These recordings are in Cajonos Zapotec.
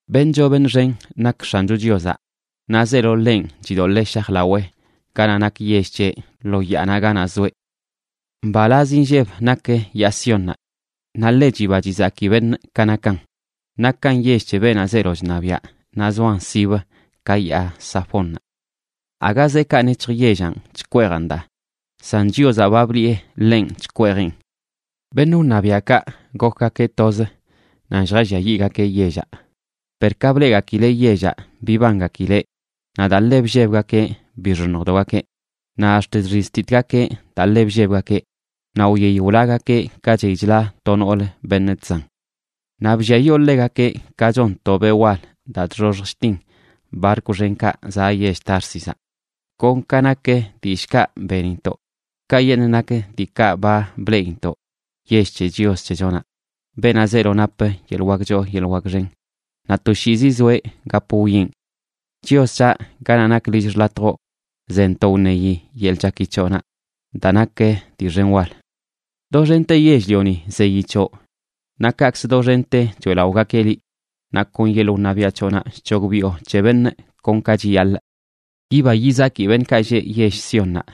Beṉꞌ choo beṉꞌ xen nak X̱ancho Chiozaꞌ, naꞌ zeelo ḻenꞌ chidoḻee shajlawee ganaꞌ nak yell c̱heꞌ, lo yaanaꞌ ganaꞌ zoeꞌ. Mbalaz inlleb nak yaa Siónnaꞌ naꞌ ḻe chiba chizaki beṉꞌ ka nakan. Nakan yell c̱he beenaꞌ zeelo chṉabiaꞌ naꞌ zoan sibə ka yaa Safónnaꞌ. Aga zeekaꞌ nec̱hj yellanꞌ chkweejan daa, san Chiozaꞌ ba bliꞌe ḻenꞌ chkweejeꞌn. Beṉꞌ wṉabiaꞌkaꞌ gokgakeꞌ toz nan lljalliayiꞌgakeꞌ yellaꞌ. Per ka bleꞌgakileꞌ yellaꞌ bibangakileꞌ, naꞌ daa ḻe bllebgakeꞌ bixoṉjdogakeꞌ. Naꞌ ax̱t chxiztitgakeꞌ daa ḻe bllebgakeꞌ, naꞌ wyey wlagakeꞌ ka chey chla to noolə beṉꞌ chzan. Naꞌ blliayoo ḻegakeꞌ ka chon to beꞌ wal daa chxoxj chtin barkw xenkaꞌ zaꞌ yell Társizaꞌ. Kon ka nak dillꞌkaꞌ benintoꞌ, kayeṉꞌ nak diikaꞌ ba bleꞌintoꞌ yell c̱he Chios c̱hechonaꞌ, beenaꞌ zeelo nap yeḻꞌ wak choo yeḻꞌ wak xen, naꞌ toshiizi zoeꞌ gap wwieꞌn. Chios c̱haꞌ, ganaꞌ nak lill xḻatjoꞌ zentoꞌ wṉeyi yeḻꞌ chaki c̱hoꞌnaꞌ daa nak dii xen wal. Doxente yell-lioni zeyi c̱hoꞌ naꞌ kaꞌkzə doxente choeꞌlaꞌogakeꞌ liꞌ. Naꞌ kon yeḻꞌ wṉabiaꞌ c̱hoꞌnaꞌ chc̱hogbiꞌo c̱he beṉꞌ kon ka chiyaḻꞌ. Yiba yizaki beṉꞌkaꞌ lleꞌ yell Siónnaꞌ,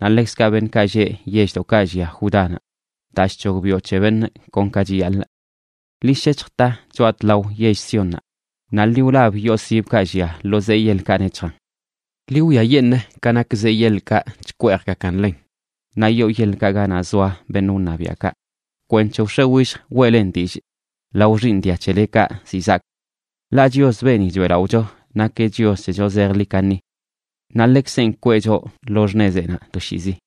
naꞌ ḻekzkaꞌ beṉꞌkaꞌ lleꞌ yelldoꞌkaꞌ llia Judánaꞌ, daa chc̱hogbiꞌo c̱he beṉꞌ kon ka chiyaḻꞌ. Ḻi shec̱hj ta choꞌa tlao yell Siónnaꞌ, naꞌ ḻi wlab yoo sibkaꞌ llia lo zee yeḻkaꞌ nec̱hjan. Ḻi wwiayeṉꞌ ka nak zee yeḻkaꞌ chkweejgakan ḻen, naꞌ yoo yeḻkaꞌ ganaꞌ zoa beṉꞌ wṉabiaꞌkaꞌ, kwenc̱he wx̱e willj weꞌlen dillꞌ lao xiiṉ dia c̱helekaꞌ ziꞌ zaak. Ḻaꞌ Chios, beeni choeꞌlaꞌocho, nakeꞌ Chios c̱hecho zejḻi kaṉi. Naꞌ ḻeꞌkzenꞌ kwee choꞌ lo xṉezeꞌnaꞌ toshiizi.